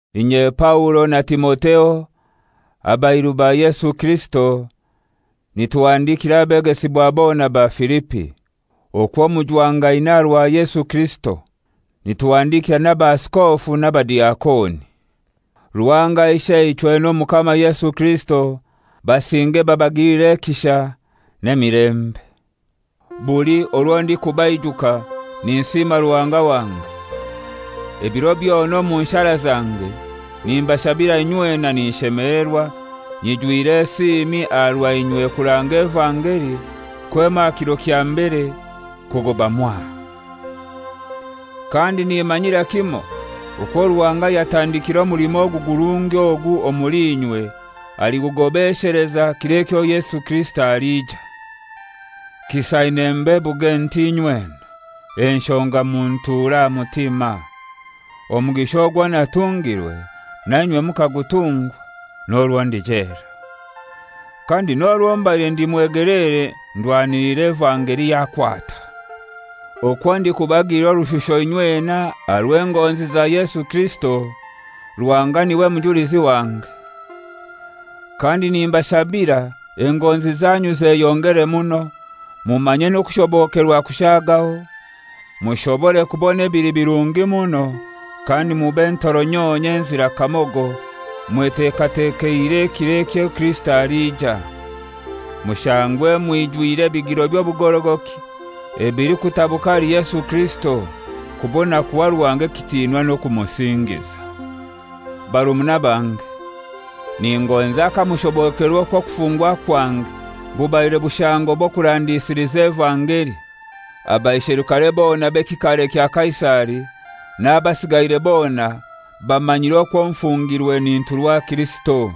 Inye Paulo na Timotheo, abairu ba Yesu Kirisito, nituhandikira abegesibwa bona ba Filipi, okwo mujwangaine aha rwa Yesu Kirisito. Nituhandikira n'abaaskofu n'abadiakoni. Ruhanga Isheichwe n'Omukama Yesu Kirisito basinge babagilire ekisha, n'emilembe. Buli orwo ndikubaijuka ninsiima Ruhanga wange. Ebiro byona omu nshara zange nimbashabira inywena ninshemelerwa nyijwire esiimi aha rwa inywe kuranga evangeli kwema aha kiro kya mbere kugoba mwaha. Kandi nimanyira kimoi okwo Ruhanga ayatandikire omulimo gurungi ogu omuli inywe aligugobesheleza kiro ekyo Yesu Kirisito alija. Kisaine mbebuge nti inywena, enshonga muntura aha mutima. Omugisha ogwo natungirwe, na inywe mukagutungwa, n'orwo ndi jela. Kandi n'orwo mbaire ndi mwegeleere ndwaniliire evangeli yakwata. Okwo ndikubagilira orushusho inywena aha rw'engonzi za Yesu Kirisito, Ruhanga niwe mujulizi wange. Kandi nimbashabira engonzi zanyu zeyongere muno, mumanye n'okushobokerwa kushaagaho, mushobore kubona ebili birungi muno, kandi mube ntoronyonyo enzira kamogo, mwetekatekeire ekiro ekyo Kirisito aliija, Mushangwe mwijwire ebigiro by'obugorogoki ebilikutabuka ahali Yesu Kirisito, kubona kuha Ruhanga ekitinwa n'okumusingiza. Barumuna bange, ningonza kamushobokerwa okwo okufungwa kwange bubaire bushango bw'okurandisiliza evangeli. Abaisherukare bona b'ekikaare kya Kaisari n'abasigaire bona bamanyiire okwo nfungirwe ninturwa Kirisito.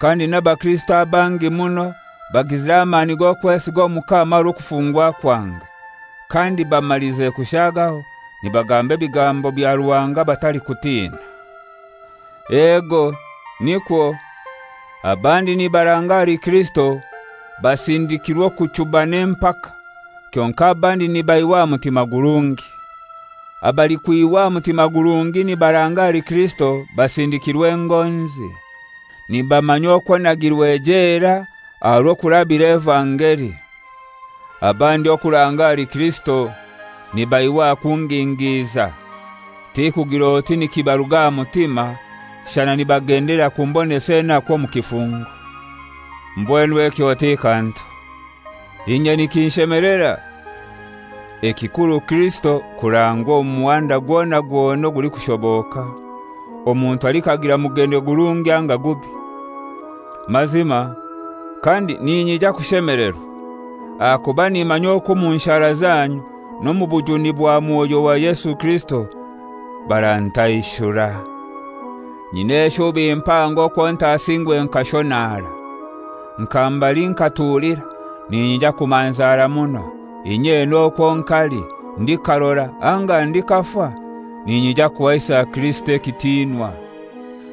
Kandi n'abakirisito abangi muno bagizire amani g'okwesiga Omukama aha rw'okufungwa kwange, kandi bamalize kushaagaho, nibagamba ebigambo bya Ruhanga batalikutina. Ego, nikwo, abandi nibaranga ahali Kirisito basindikirwe okuchuba n'empaka, kyonkai abandi nibaihwa aha mutima gurungi. Abalikwihwa aha mutima gurungi nibaranga ahali Kirisito basindikirwe engonzi, nibamanya okwo nagirwe jela aha rw'okurabira evangeli. Abandi okuranga ahali Kirisito nibaihwa aha kungingiza, tikugir'oti nikibaruga aha mutima, shana nibagendelera kumbonesa enaku omu kifungo. Mbwenu ekyo ti kantu! Inye nikinshemelera; ekikuru Kirisito kurangwa omu muhanda gwona gwona ogulikushoboka, omuntu alikagira mugendelero gurungi anga gubi. Mazima, kandi ninyija kushemelerwa! Ahakuba nimanya okwo omu nshara zanyu n'omu bujuni bwa Mwoyo wa Yesu Kirisito, barantaishura. Nyina eshubi mpango okwo ntasingwe nkashonara. Nka mbali nkatulira ninyija kumanzara muno, inyena okwo nkali, ndikarora anga ndikafa, ninyija kuhaisa Kirisito ekitinwa.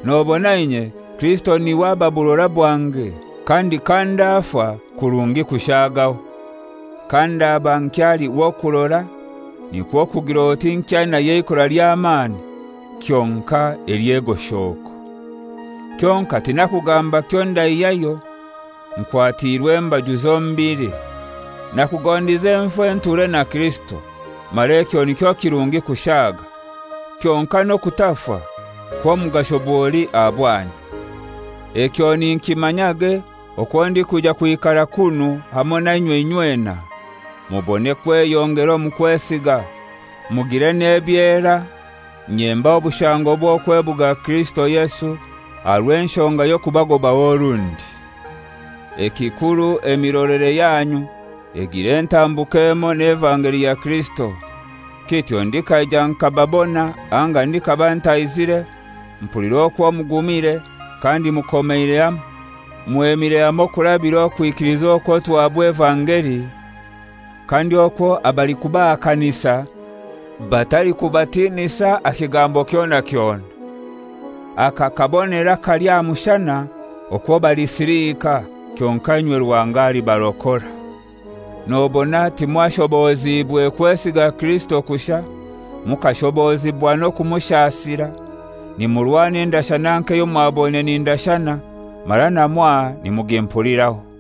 Nobona inye Kirisito niwe aba burora bwange; kandi kandafa kurungi kushaagaho. Kandaba nkyali w'okurora nikwo kugir'oti nkyainayo eikora ly'amani kyonkai ely'egoshoko. Kyonkai tinakugamba kyondaihyaho. Nkwatiirwe embaju zombili. Nakugondize nfe nture na Kirisito, mara ekyo nikyo kirungi kushaaga. Kyonkai n'okufa kw'omugasho bwoli aha bwanyu. Ekyo ninkimanyage okwo ndikwija kwikara kunu hamoi nainywe inywena, mubone kweyongera omu kwesiga, mugire n'ebyera, inye mbahe obushango bw'okwebuga Kirisito Yesu, aha rw'enshonga y'okubagobaho orundi. Ekikuru emirolere yanyu egire entambuka emoi n'evangeli ya Kirisito: Kityo ndikaija nkababona anga ndikaba ntaizire, mpulire okwo mugumire kandi mukomeire hamoi, kandi mwemire hamoi kurabira okwikiliza okwo tuhabwa evangeli, kandi okwo abalikubahakanisa batalikubatinisa aha kigambo kyona kyona. Aka kabonero akali aha mushana, okwo balisilika kyonkai inywe Ruhanga alibarokora. Nobona timwashobozibwe kwesiga Kirisito kushai, mukashoboziibwa n'okumushasira, nimurwana endashana nk'eyo mwaboine nindashana, mara na mwaha nimugimpuliraho.